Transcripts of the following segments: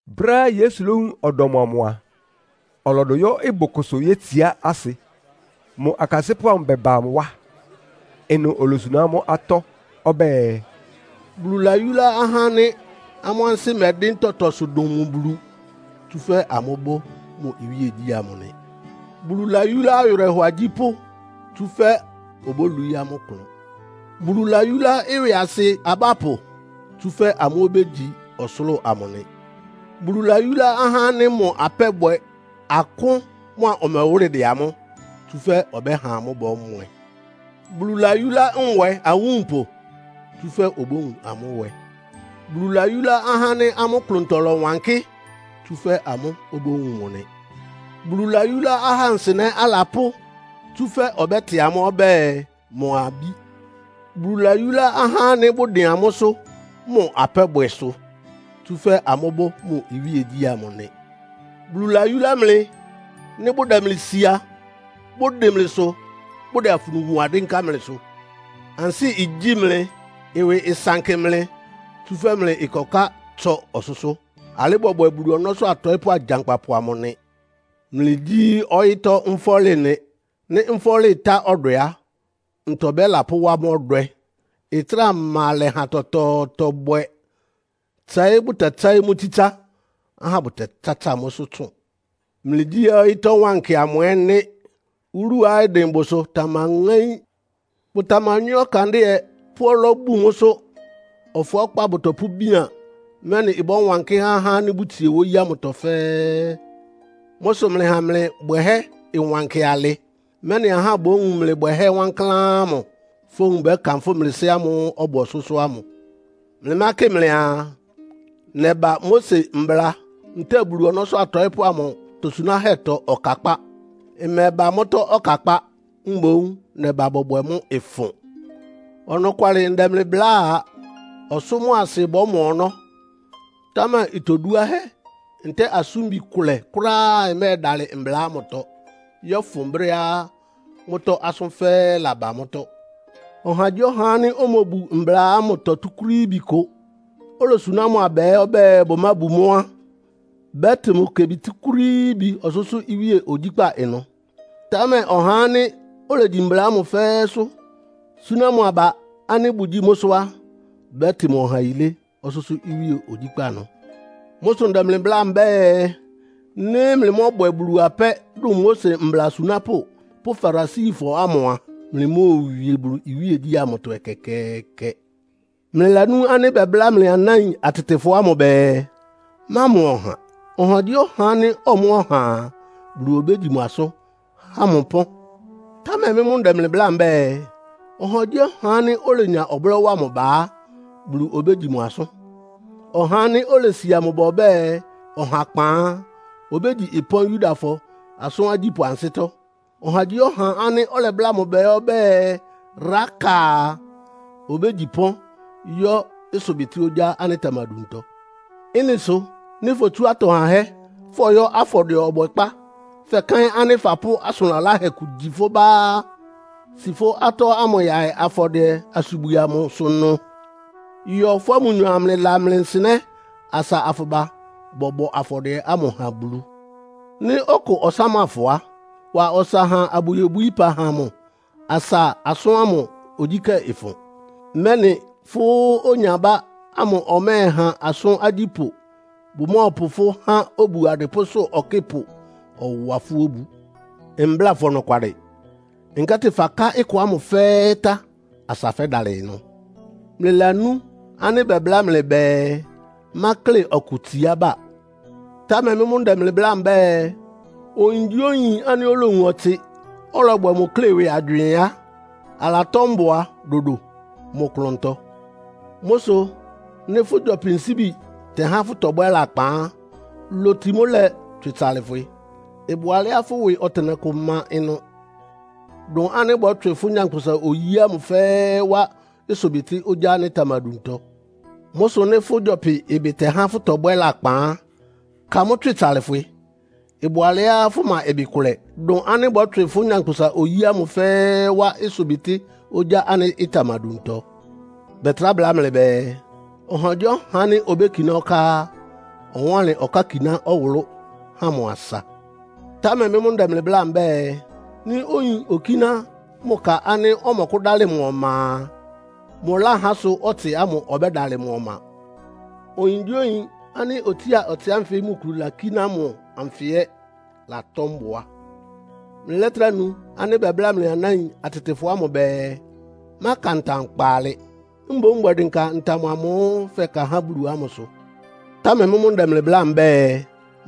Brɛ́á Yesu lówun ɔdɔm amʋ a, ɔlɔdʋ yɔ́ ɩbʋ kʋsʋ yétsiá asɩ, mʋ akasɩ́pʋ́ amʋ bɛba mʋ wá. Ɩnʋ olosuná amʋ́ atɔ́ ɔbɛ́ɛ, “Bulu layúlá ahá ánɩ́ amʋ́ ansɩ́ mɛdɩ́n tɔtɔsʋ dʋn mʋ Bulu, tsúfɛ́ amʋ́bʋ́ mʋ iwíegyí ámʋ nɩ. Bulu layúlá awɩrɛhɔ agyípʋ́, tsúfɛ́ obólwií amʋ́ klʋn. Bulu layúlá ɩwɩasɩ abápʋ, tsúfɛ́ amʋ́ obégyi ɔsʋlʋ́ʋ amʋ nɩ. Bulu layúlá ahá ánɩ́ mʋ apɛ́bwɛ akʋ́n mʋ́a ɔmɛwʋ́lɩ dɛ amʋ́, tsúfɛ́ ɔbɛ́ha amʋ́ bɔ́mwɛ. Bulu layúlá nwɛ awúnpʋ, tsúfɛ́ obówun amʋ́ nwɛ. Bulu layúlá ahá ánɩ́ amʋ́ klʋntɔ lɔwankɩ́, tsúfɛ́ amʋ́ obówun mʋ nɩ. Bulu layúlá ahá nsɩnɛ́ alapʋ́, tsúfɛ́ ɔbɛ́tɩ amʋ́ ɔbɛ́ɛ mʋ abí. Bulu layúlá ahá ánɩ́ bʋdɩn amʋ́sʋ́ mʋ apɛ́bwɛ sʋ, tsúfɛ́ amʋ́bʋ́ mʋ iwíegyí amʋ nɩ. “Bulu layúlá mlɩ, nɩ́ bʋdɛ mlɩ sia, bʋdɩn mlɩsʋ, bʋdɛ afunu wa dɩ́nká mlɩsʋ. Ansɩ́ igyí mlɩ, ɩwɩ ɩsankɩ mlɩ, tsúfɛ́ mlɩ ɩkɔká tsɔ ɔsʋ́sʋ́. Alɩ́ bɔbwɛ Bulu ɔnɔ́sʋ́ atɔɩ́pʋ́ agyankpapʋ amʋ nɩ. “Mlɩgyí ɔyɩ́tɔ́ nfɔ́lɩ nɩ. Nɩ́ nfɔ́lɩ ɩtá ɔdwɛ á, ntɔ bɛ́lapʋ́wá mʋ́ ɔdwɛ? Ɩtráa ma alɛ há tɔtɔɔtɔ bwɛ. Tsɛɩ́ bʋtɛtsɛ́ɩ́ mʋ́ tsítsá, ahá bʋtɛtsátsa mʋ́sʋ́ tsʋn. “Mlɩgyí ɔyɩ́tɔ́ wankɩ ɛ́ nɩ́. Wúluá ɩdɩn bʋsʋ tamaŋáín. Bʋtamanywɛ́ ɔkandɩ́ɛ, pʋ́ ɔlɔ́ bun mʋ́sʋ́. Ɔfʋákpá bʋtɔpʋ́bían, mɛ́nɩ ɩbɔ́wankɩ́ há ahá ánɩ́ bʋtsie wóyí ámʋtɔ fɛ́ɛ́. Mʋ́ sʋ mlɩha mlɩ bwɛhɛ́ ɩwankɩ alɩ, mɛ́nɩ ahá bówun mlɩ bwɛhɛ́ wankláán ámʋ, fówun bɛ́kanfʋ́ mlɩ Sɩ́ ámʋ́ʋ́ ɔbʋ ɔsʋ́sʋ́ ámʋ. “Mlɩmákɩ mlɩaa, nɛba Mose Mbla ntɛ́ɛ Bulu ɔnɔ́sʋ́ atɔɩ́pʋ́ amʋ atosunáhɛ́tɔ ɔkakpá. Mmɛba mʋ́tɔ́ ɔkakpá, mboún nɛbá bɔbwɛ mʋ́ ɩfʋn. Ɔnɔkwalɩ ndɛ mlɩ bláa, ɔsʋ́ mʋ́a asɩ bɔ́mɔ ɔnɔ́, támɛ itoduáhɛ́ ntɛ́ɛ asʋ́nbi kʋlɛ kʋ́ráá ɩmɛ́ɛdalɩ Mbla ámʋtɔ, yɔ́fʋn brɛ́á mʋ́tɔ́ asʋ́n fɛ́ɛ́ laba mʋ́tɔ́. Ɔhagyíɔha ánɩ́ omobu mbla ámʋtɔ túkúrííbi kʋ, olosuná mʋ aba ɛ́ ɔbɛ́ɛ bʋmábu mʋ́ á, bɛ́tɩ mʋ kebi túkúrííbi ɔsʋ́sʋ́ iwíe ogyíkpá ɩnʋ. Támɛ ɔhá ánɩ́ olegyi mbla ámʋ fɛ́ɛ́sʋ́, súná mʋ aba ánɩ́ bʋgyíi mʋ́sʋ́ á, bɛ́tɩ mʋ ɔha yilé ɔsʋ́sʋ́ iwíe ogyíkpá ɩnʋ. Mʋ́ sʋ ndɛ mlɩ bláa mbɛ́ɛ, nɩ́ mlɩmɔ́bwɛ Bulu apɛ́ dʋn Mose mbla asunápʋ́ pʋ́ Farisifɔ ámʋ a, mlɩmóowie Bulu iwíegyí amʋtɔ ɛkɛkɛɛkɛ. “Mlɩlanú ánɩ́ bɛbláa mlɩ anáin atɩtɩfɔ ámʋ bɛɛ, ‘Mámɔ ɔha. Ɔhagyíɔha ánɩ́ ɔmɔ́ ɔha a, Bulu obégyi mʋ asʋ́n, há mʋ ɩpɔ́n.’ Támɛ mɩ́ mʋ́ ndɛ mlɩ bláa mbɛ́ɛ, ɔhagyíɔha ánɩ́ olenya ɔblɔ́ wa mʋ ba á, Bulu obégyi mʋ asʋ́n. Ɔhá ánɩ́ olesia mʋ ba ɔbɛ́ɛ, ‘Ɔhakpan!’ á, obégyi ɩpɔ́n Yudafɔ asʋ́n agyípʋ́ ansɩ́tɔ́. Ɔhagyíɔha ánɩ́ ɔlɛbláa mʋ ba ɛ́ ɔbɛ́ɛ, ‘Raka!’ a, obégyi ɩpɔ́n yɔ́ ɩsʋbɩtɩ́ ogyá ánɩ́ ɩtamaduntɔ. Ɩ́nɩ sʋ nɩ́ fotsu atɔ hahɛ́ fɔyɔ́ afɔdɩɛ ɔbɔkpá, fɛkaɩ́n ánɩ́ fapʋ́ asʋn laláhɛ kʋ gyi fʋ́ bá á, si fʋ́ atɔ́ amʋ́ yaɩ afɔdɩɛ-asubwisʋ ɩnʋ. Yɔ fʋ́a mʋnyɔ amlɩla mlɩ nsɩnɛ́, asa afʋba bɔbɔ afɔdɩɛ ámʋ ha Bulu. “Nɩ́ ɔkʋ ɔsáma fʋ á, wa ɔsa ha abʋyobwií ɩpa ha mʋ asa asʋ́n ámʋ ogyíkɛ́ ɩfʋn, mɛ́nɩ fʋ́ onyabá ámʋ ɔmɛ́ɛha asʋ́n agyípʋ́ bʋmɔ́ɔpʋ fʋ́ ha obu adɩpʋ́sʋ́ ɔkɩ́pʋ, ɔwa fʋ́ obu. Mbláa fʋ ɔnɔkwalɩ, nkɛ́tɩ faká ɩkɔ ámʋ fɛ́ɛ́ tá asa fɛ́dalɩ ɩnʋ. “Mlɩlanú ánɩ́ bɛbláa mlɩ bɛɛ, ‘Mákle ɔkʋ tsiába.’ Támɛ mɩ́ mʋ́ ndɛ mlɩ bláa mbɛ́ɛ, oyingyíoyin ánɩ́ olowun ɔtsɩ, ɔlɔbwɛ mʋ klé ɩwɩ agywɩɩn á, alatɔ́ mbʋa dodo mʋ klʋntɔ. Mʋ́ sʋ nɩ́ fʋ́ gyɔpɩ nsíbi tɛhá fʋ́tɔbwɛ́ lakpan á, loti mʋ́ lɛ, tswɩ tsalɩfwɩ. Ɩbʋ alɛ́á fʋ́ ɩwɩ ɔtɩnɛkʋ má ɩnʋ, dʋn ánɩ́ bɔ́tswɩ fʋ́ nyankpʋsa-oyí ámʋ fɛ́ɛ́ wá ɩsʋbɩtɩ́ ogyá ánɩ́ ɩtamaduntɔ. Mʋ́ sʋ nɩ́ fʋ́ gyɔpɩ ɩbɩ tɛhá fʋ́tɔbwɛ́ lakpan á, ka mʋ́ tswɩ tsalɩfwɩ. Ɩbʋ alɛ́á fʋma ɩbɩ kʋlɛ, dʋn ánɩ́ bɔ́tswɩ fʋ́ nyankpʋsa-oyí ámʋ fɛ́ɛ́ wá ɩsʋbɩtɩ́ ogyá ánɩ́ ɩtamaduntɔ. “Bɛtrá bláa mlɩ bɛɛ, ‘Ɔhagyíɔha ánɩ́ obékiná ɔká á, ɔwánlɩn ɔkákiná ɔwʋlʋ́ ha mʋ asa.’ Támɛ mɩ́ mʋ́ ndɛ mlɩ bláa mbɛ́ɛ, nɩ́ oyin okíná mʋ ka ánɩ́ ɔmɔkʋ́dálɩ mʋ ɔma a, mʋláhá sʋ ɔtsɩ ámʋ ɔbɛ́dalɩ mʋ ɔma. Oyingyíoyin ánɩ́ otsía ɔtsɩ ánfɩ mʋ kulu lakíná mʋ anfɩ ɛ́ latɔ́ mbʋa. “Mlɩlɛ́trá nu ánɩ́ bɛbláa mlɩ anáin atɩtɩfɔ ámʋ bɛɛ, ‘Máka ntam kpaalɩ. Mboún bwɛ dɩnka ntam amʋ́ʋ́ fɛka há Bulu ámʋsʋ.’ Támɛ mɩ́ mʋ́ ndɛ mlɩ bláa mbɛ́ɛ,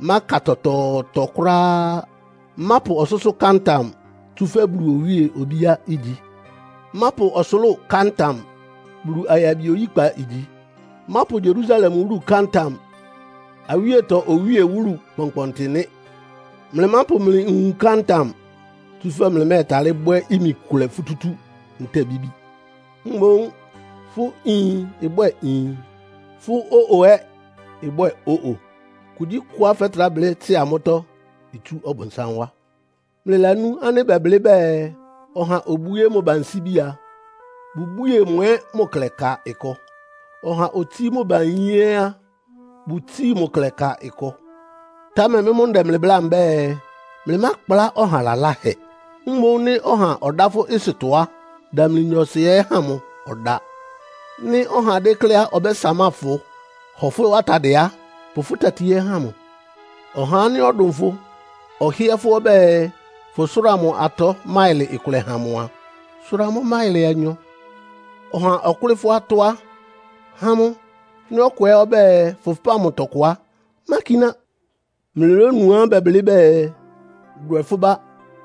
máka tɔtɔɔtɔ kʋ́ráá. Mápʋ ɔsʋ́sʋ́ ká ntam, tsúfɛ́ Bulu owíe obíá igyi. Mápʋ ɔsʋlʋ́ʋ ká ntam. Bulu ayabi oyíkpa igyi. Mápʋ Yerusalem wúlu ká ntam. Awíetɔ Owíe wúlu kpɔnkpɔntɩ nɩ́. Mlɩmápʋ mlɩ nwun ká ntam, tsúfɛ́ mlɩmɛ́ɛtalɩ́ bwɛ́ imi kʋlɛ futútú ntɛ́ɛ bíbi. Mboún fʋ́ ‘Iin!’ ɩbwɛ́ɛ ‘Iin!’ Fʋ́ ‘Ó-o!’ ɛ́ ɩbwɛ ‘Ó-o!’ Kugyíkʋá fɛ́trá blɩ́ tsɩ́a mʋ́tɔ́ itsú Ɔbʋnsám wá. “Mlɩlanú ánɩ́ bɛblɩ́ bɛɛ, ‘Ɔha obwíé mʋ ba nsíbi a, bʋbwíe mʋ ɛ́ mʋ klɛ ka ɩkɔ. Ɔha otsíí mʋ ba iyín ɛ́ á, bʋtsíi mʋ klɛ ka ɩkɔ.’ Támɛ mɩ́ mʋ́ ndɛ mlɩ bláa mbɛ́ɛ, mlɩmákplá ɔha laláhɛ. Mboún nɩ́ ɔha ɔdá fʋ́ ɩsʋtɔ á, damli nyɔɔsɩ ɛ́ ha mʋ ɔdáa. Nɩ́ ɔha dékléá ɔbɛ́samáa fʋ, hɔ fʋ́ atadɩɛ á, pʋ fʋ́ tati ɛ́ ha mʋ. Ɔhá ánɩ́ ɔdʋn fʋ ɔhɩ́ɛ́ fʋ́ ɔbɛ́ɛ, fʋsʋ́ra mʋ atɔ́ máɩlɩ kʋlɛ ha mʋ a, sʋra mʋ́ máɩlɩ anyɔ. Ɔha ɔkʋ́lɩ́ fʋ́ atɔ́ á, ha mʋ. Nɩ́ ɔkʋ ɛ́ ɔbɛ́ɛ fʋpáan mʋ tɔkʋ á, mákiná. “Mlɩlónuá bɛblɩ́ bɛɛ, ‘Dwɛ fʋ́ bá,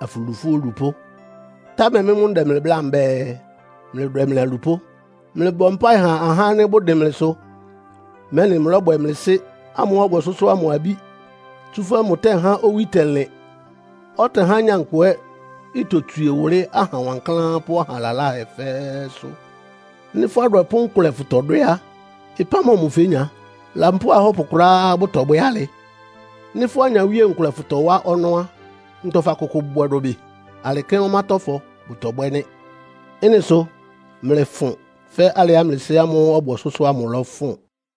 afʋlu fʋ́ olupʋ́.’ Támɛ mɩ́ mʋ́ ndɛ mlɩ bláa mbɛ́ɛ, mlɩdwɛ mlɩ alupʋ́. Mlɩbɔ mpáɩ ha ahá ánɩ́ bʋdɩn mlɩsʋ, mɛ́nɩ mlɔ́bwɛ mlɩ Sɩ́ ámʋ́ʋ́ ɔbʋ ɔsʋ́sʋ́ ámʋ abí. Tsúfɛ́ mʋtɛ́há owí tɛlɩn, ɔtɛhá nyankpʋ ɛ́ itotswie wʋlɩ́ aha wankláán pʋ́ aha laláhɛ fɛ́ɛ́sʋ́. Nɩ́ fʋ́ adwɛpʋ́ nkʋlɛ fʋtɔdwɛ́ á, ɩpán mɔmʋ fénya? Lampóo ahɔ́pʋ kʋ́ráá bʋtɔbwɛ́ alɩ. Nɩ́ fʋ́ anyawíe nkʋlɛ fʋtɔwá ɔnɔ́ á, ntɔ fakʋkʋ bwɛ dʋbɩ? Alɩ kɛ́n ɔmátɔ́fɔ bʋtɔbwɛ́ nɩ́. Ɩ́nɩ sʋ mlɩfʋn fɛ́ alɩá mlɩ Sɩ́ ámʋ́ʋ́ ɔbʋ ɔsʋ́sʋ́ ámʋ lɔ́fʋn.